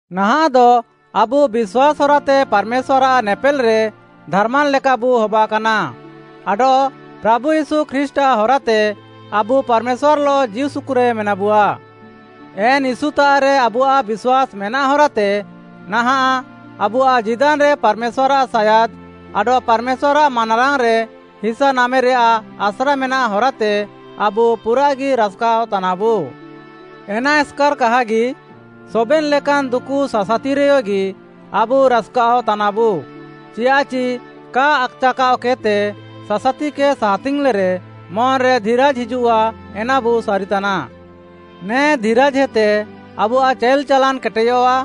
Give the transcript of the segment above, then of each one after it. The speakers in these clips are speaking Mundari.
ନାହାଃଁଦ ଆବୁ ବିଶ୍ୱାସ୍‌ ହରାତେ ପାର୍‌ମେଶ୍ୱାର୍‌ଆଃ ନେପେଲ୍‌ରେ ଧାର୍‌ମାନ୍‌ ଲେକାବୁ ହବାକାନା ଆଡଃ ପ୍ରାଭୁ ୟୀଶୁ ଖ୍ରୀଷ୍ଟ୍‌ଆଃ ହରାତେ ଆବୁ ପାର୍‌ମେଶ୍ୱାର୍‌ଲଃ ଜୀଉସୁକୁରେ ମେନାବୁଆ। ଏନ୍‌ ୟୀଶୁତାଃରେ ଆବୁଆଃ ବିଶ୍ୱାସ୍‌ ମେନାଃ ହରାତେ ନାହାଁଃ ଆବୁଆଃ ଜୀଦାନ୍‌ରେ ପାର୍‌ମେଶ୍ୱାର୍‌ଆଃ ସାୟାଦ୍‌ ଆଡଃ ପାର୍‌ମେଶ୍ୱାର୍‌ଆଃ ମାନାରାଙ୍ଗ୍‌ରେ ହିସା ନାମେରେୟାଃ ଆସ୍ରା ମେନାଃ ହରାତେ ଆବୁ ପୁରାଃଗି ରାସ୍‌କାଅଃ ତାନାବୁ। ଏନା ଏସ୍‌କାର୍‌ କାହାଗି, ସବେନ୍‌ ଲେକାନ୍‌ ଦୁକୁ ସାସାତିରେୟଗି ଆବୁ ରାସ୍‌କାଅଃ ତାନାବୁ, ଚିୟାଃଚି କା ଆକ୍‌ଚାକାଅ କେଦ୍‌ତେ ସାସାତିକେ ସାହାତିଙ୍ଗ୍‌ଲେରେ ମନ୍‌ରେ ଧିରାଜ୍‌ ହିଜୁଃଆ ଏନାବୁ ସାରିତାନା। ନେ ଧିରାଜ୍‌ହେତେ ଆବୁଆଃ ଚାଇଲ୍‌ ଚାଲାନ୍‌ କେଟେୟଃଆ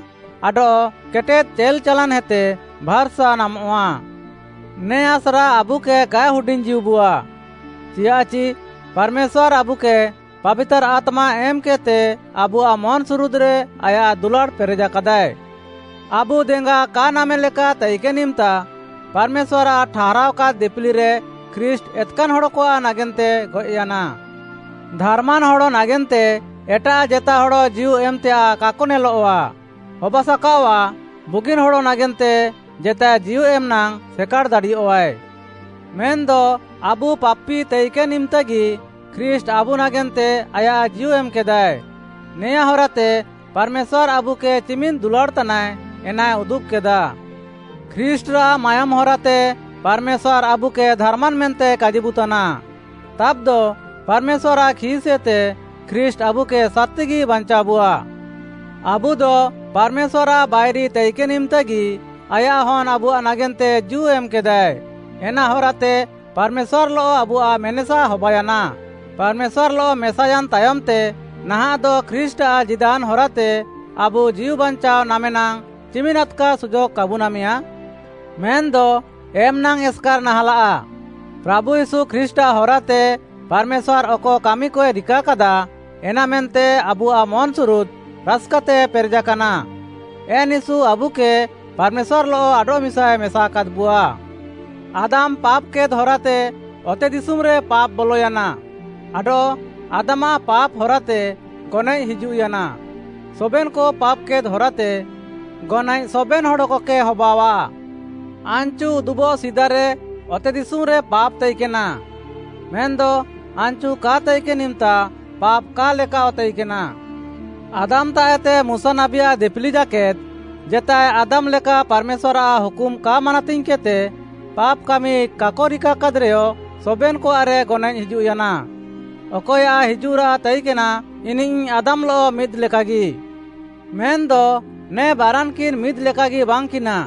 ଆଡଃ କେଟେଦ୍‌ ଚାଇଲ୍‌ ଚାଲାନ୍‌ହେତେ ଭାର୍‌ସା ନାମଃଆ। ନେ ଆସ୍ରା ଆବୁକେ କାଏ ହୁଡିଙ୍ଗ୍‌ଜୀଉବୁଆ, ଚିୟାଃଚି ପାର୍‌ମେଶ୍ୱାର୍‌ ଆବୁକେ ପାବିତାର୍‌ ଆତ୍ମା ଏମ୍‌କେଦ୍‌ତେ ଆବୁଆଃ ମନ୍‌ସୁରୁଦ୍‌ରେ ଆୟାଃ ଦୁଲାଡ଼୍‌ ପେରେଃକାଦାଏ। ଆବୁ ଦେଙ୍ଗା କା ନାମେଲେକା ତାଇକେନ୍‌ ଇମ୍‌ତା, ପାର୍‌ମେଶ୍ୱାର୍‌ଆଃ ଠାହାରାଅକାଦ୍‌ ଦିପିଲିରେ, ଖ୍ରୀଷ୍ଟ୍‌ ଏତ୍‌କାନ୍‌ ହଡ଼କଆଃ ନାଗେନ୍ତେ ଗଏଃୟାନା। ଧାର୍‌ମାନ୍ ହଡ଼ ନାଗେନ୍ତେ ଏଟାଃ ଜେତା ହଡ଼ ଜୀଉ ଏମ୍‌ତେୟାଃ କାକ ନେଲଃଆ। ହବାସାକାଅଆଃ ବୁଗିନ୍‌ ହଡ଼ ନାଗେନ୍ତେ ଜେତାଏ ଜୀଉ ଏମ୍‌ ନାଙ୍ଗ୍‌ ସେକାଡ଼୍‌ ଦାଡ଼ିୟଃଆଏ। ମେନ୍‌ଦ ଆବୁ ପାପି ତାଇକେନ୍‌ ଇମ୍‌ତାଗି ଖ୍ରୀଷ୍ଟ୍‌ ଆବୁ ନାଗେନ୍ତେ ଆୟାଃ ଜୀଉ ଏମ୍‌କେଦାଏ, ନେଆଁଁ ହରାତେ ପାର୍‌ମେଶ୍ୱାର୍‌ ଆବୁକେ ଚିମିନ୍‌ ଦୁଲାଡ଼୍‌ତାନାଏ ଏନାଏ ଉଦୁବ୍‌କେଦା। ଖ୍ରୀଷ୍ଟ୍‌ରାଃ ମାୟୋମ୍‌ ହରାତେ ପାର୍‌ମେଶ୍ୱାର୍‌ ଆବୁକେ ଧାର୍‌ମାନ୍ ମେନ୍ତେ କାଜିବୁତାନା। ତାବ୍‌ଦ ପାର୍‌ମେଶ୍ୱାର୍‌ଆଃ ଖିସ୍‌ଏତେ ଖ୍ରୀଷ୍ଟ୍‌ ଆବୁକେ ସାର୍‌ତିଗି ବାଞ୍ଚାଅବୁଆ। ଆବୁଦ ପାର୍‌ମେଶ୍ୱାର୍‌ଆଃ ବାଇରି ତାଇକେନ୍‌ ଇମ୍‌ତାଗି ଆୟାଃ ହନ୍‌ ଆବୁଆଃ ନାଗେନ୍ତେ ଜୀଉ ଏମ୍‌କେଦା, ଏନା ହରାତେ ପାର୍‌ମେଶ୍ୱାର୍‌ଲଃ ଆବୁଆଃ ମେନେସା ହବାୟାନା। ପାର୍‌ମେଶ୍ୱାର୍‌ଲଃ ମେସାୟାନ୍‌ ତାୟମ୍‌ତେ ନାହାଃଁଦ ଖ୍ରୀଷ୍ଟ୍‌ଆଃ ଜୀଦାନ୍‌ ହରାତେ ଆବୁ ଜୀଉ ବାଞ୍ଚାଅ ନାମେ ନାଙ୍ଗ୍‌ ଚିମିନ୍‌ ଆଦ୍‌କା ସୁଯୋଗ୍‌ କାବୁ ନାମେୟାଁ? ମେନ୍‌ଦ ଏମ୍‌ନାଙ୍ଗ୍‌ ଏସ୍‌କାର୍‌ ନାହାଁଲାଃ, ପ୍ରାଭୁ ୟୀଶୁ ଖ୍ରୀଷ୍ଟ୍‌ଆଃ ହରାତେ ପାର୍‌ମେଶ୍ୱାର୍‌ ଅକ କାମିକଏ ରିକାକାଦା, ଏନାମେନ୍ତେ ଆବୁଆଃ ମନ୍‌ସୁରୁଦ୍‌ ରାସ୍‌କାତେ ପେରେଜାକାନା। ଏନ୍‌ ୟୀଶୁ ଆବୁକେ ପାର୍‌ମେଶ୍ୱାର୍‌ଲଃ ଆଡଃମିସାଏ ମେସାକାଦ୍‌ବୁଆ। ଆଦାମ୍‌ ପାପ୍‌କେଦ୍‌ ହରାତେ ଅତେଦିଶୁମ୍‌ରେ ପାପ୍‌ ବଲୟାନା ଆଡଃ ଆଦାମ୍‌ଆଃ ପାପ୍‌ ହରାତେ ଗନଏଃ ହିଜୁଃୟାନା। ସବେନ୍‌କ ପାପ୍‌କେଦ୍‌ ହରାତେ ଗନଏଃ ସବେନ୍‌ ହଡ଼କକେ ହବାଅଃଆ। ଆନ୍‌ଚୁ ଉଦୁବଃ ସିଦାରେ ଅତେଦିଶୁମ୍‌ରେ ପାପ୍‌ ତାଇକେନା, ମେନ୍‌ଦ ଆନ୍‌ଚୁ କା ତାଇକେନ୍‌ ଇମ୍‌ତା ପାପ୍‌ କା ଲେକାଃଅ ତାଇକେନା। ଆଦାମ୍‌ତାଃଏତେ ମୁଶା ନାବୀଆଃ ଦିପିଲି ଜାକେଦ୍‌ ଜେତାଏ ଆଦାମ୍ ଲେକା ପାର୍‌ମେଶ୍ୱାର୍‌ଆଃ ହୁକୁମ୍‌ କା ମାନାତିଙ୍ଗ୍‌କେଦ୍‌ତେ ପାପ୍‌ କାମି କାକ ରିକାକାଦ୍‌ରେୟ, ସବେନ୍‌କଆଃରେ ଗନଏଃ ହିଜୁଃୟାନା। ଅକଏୟାଃ ହିଜୁଃରାଃ ତାଇକେନା, ଇନିଃ ଆଦାମ୍‌ଲଃ ମିଦ୍‌ଲେକାଗି। ମେନ୍‌ଦ ନେ ବାରାନ୍‌କିନ୍‌ ମିଦ୍‌ଲେକାଗି ବାଙ୍ଗ୍‌କିନା।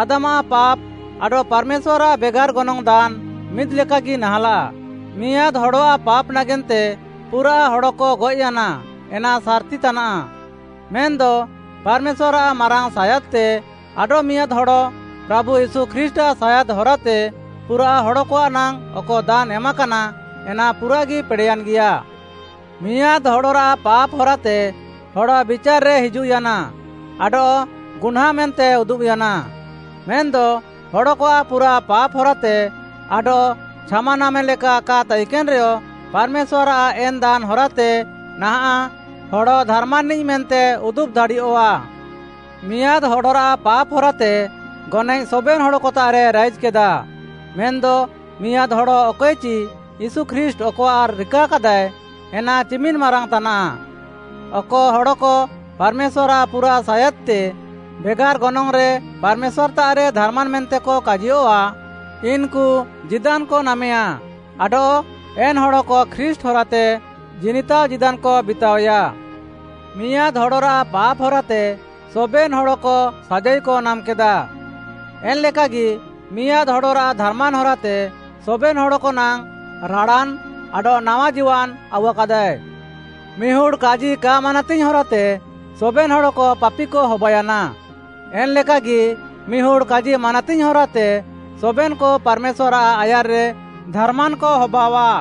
ଆଦାମ୍‌ଆଃ ପାପ୍‌ ଆଡଃ ପାର୍‌ମେଶ୍ୱାର୍‌ଆଃ ବେଗାର୍‌ ଗନଙ୍ଗ୍‌ ଦାନ୍‌ ମିଦ୍‌ଲେକାଗି ନାହାଁଲାଃ। ମିଆଁଦ୍‌ ହଡ଼ଆଃ ପାପ୍‌ ନାଗେନ୍ତେ ପୁରାଃ ହଡ଼କ ଗଏଃୟାନା ଏନା ସାର୍‌ତି ତାନାଃ। ମେନ୍‌ଦ ପାର୍‌ମେଶ୍ୱାର୍‌ଆଃ ମାରାଙ୍ଗ୍‌ ସାୟାଦ୍‌ତେ, ଆଡଃମିଆଁଦ୍‌ ହଡ଼, ପ୍ରାଭୁ ୟୀଶୁ ଖ୍ରୀଷ୍ଟ୍‌ଆଃ ସାୟାଦ୍‌ ହରାତେ ପୁରାଃ ହଡ଼କଆଃ ନାଙ୍ଗ୍‌ ଅକ ଦାନ୍‌ ଏମାକାନା, ଏନା ପୁରାଃଗି ପେଡ଼େୟାନ୍‌ଗିୟା। ମିଆଁଦ୍‌ ହଡ଼ରାଃ ପାପ୍‌ ହରାତେ ହଡ଼ ବିଚାର୍‌ରେ ହିଜୁଃୟାନା ଆଡଃ ଗୁହ୍ନାଁ ମେନ୍ତେ ଉଦୁବ୍‌ୟାନା, ମେନ୍‌ଦ ହଡ଼କଆଃ ପୁରାଃ ପାପ୍‌ ହରାତେ ଆଡଃ ଛାମା ନାମେଲେକା କା ତାଇକେନ୍‌ରେୟ, ପାର୍‌ମେଶ୍ୱାର୍‌ଆଃ ଏନ୍‌ ଦାନ୍‌ ହରାତେ, ନାହାଁଃ ହଡ଼ ଧାର୍‌ମାନ୍‌ନିଃ ମେନ୍ତେ ଉଦୁବ୍‌ ଦାଡ଼ିୟଃଆ। ମିଆଁଦ୍‌ ହଡ଼ରାଃ ପାପ୍‌ ହରାତେ ଗନଏଃ ସବେନ୍‌ ହଡ଼କତାଃରେ ରାଇଜ୍‌କେଦା, ମେନ୍‌ଦ ମିଆଁଦ୍‌ ହଡ଼ ଅକଏଚି ୟୀଶୁ ଖ୍ରୀଷ୍ଟ୍‌ ଅକଆଃ ରିକାକାଦାଏ, ଏନା ଚିମିନ୍‌ ମାରାଙ୍ଗ୍‌ ତାନାଃ। ଅକ ହଡ଼କ ପାର୍‌ମେଶ୍ୱାର୍‌ଆଃ ପୁରାଃ ସାୟାଦ୍‌ତେ ବେଗାର୍‌ ଗନଙ୍ଗ୍‌ରେ ପାର୍‌ମେଶ୍ୱାର୍‌ତାଃରେ ଧାର୍‌ମାନ୍‌ ମେନ୍ତେକ କାଜିୟଃଆ, ଇନ୍‌କୁ ଜୀଦାନ୍‌କ ନାମେୟାଁ ଆଡଃ ଏନ୍‌ ହଡ଼କ ଖ୍ରୀଷ୍ଟ୍‌ ହରାତେ ଜିନିତାଅ ଜୀଦାନ୍‌କ ବିତାଅୟା। ମିଆଁଦ୍‌ ହଡ଼ରାଃ ପାପ୍‌ ହରାତେ ସବେନ୍‌ ହଡ଼କ ସାଜାଇକ ନାମ୍‌କେଦା, ଏନ୍‌ଲେକାଗି ମିଆଁଦ୍‌ ହଡ଼ରାଃ ଧାର୍‌ମାନ୍‌ ହରାତେ ସବେନ୍‌ ହଡ଼କ ନାଙ୍ଗ୍‌ ରାଡ଼ାନ୍‌ ଆଡଃ ନାୱା ଜୀଦାନ୍‌ ଆଉୱାକାଦାଏ। ମିହୁଡ଼୍‌ କାଜି କା ମାନାତିଙ୍ଗ୍‌ ହରାତେ ସବେନ୍‌ ହଡ଼କ ପାପିକ ହବାୟାନା, ଏନ୍‌ଲେକାଗି ମିହୁଡ଼୍‌ କାଜି ମାନାତିଙ୍ଗ୍‌ ହରାତେ ସବେନ୍‌କ ପାର୍‌ମେଶ୍ୱାର୍‌ଆଃ ଆୟାର୍‌ରେ ଧାର୍‌ମାନ୍‌କ ହବାଅଃଆ।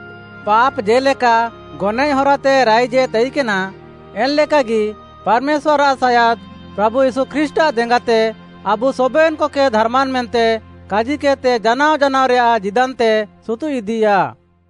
ପାପ୍‌ ଜେ'ଲେକା ଗନଏଃ ହରାତେ ରାଇଜେ ତାଇକେନା, ଏନ୍‌ଲେକାଗି ପାର୍‌ମେଶ୍ୱାର୍‌ଆଃ ସାୟାଦ୍‌ ପ୍ରାଭୁ ୟୀଶୁ ଖ୍ରୀଷ୍ଟ୍‌ଆଃ ଦେଙ୍ଗାତେ ଆବୁ ସବେନ୍‌କକେ ଧାର୍‌ମାନ୍‌ ମେନ୍ତେ କାଜିକେଦ୍‌ତେ ଜାନାଅ ଜାନାଅରେୟାଃ ଜୀଦାନ୍‌ତେ ସୁତୁଃଇଦିୟାଃ।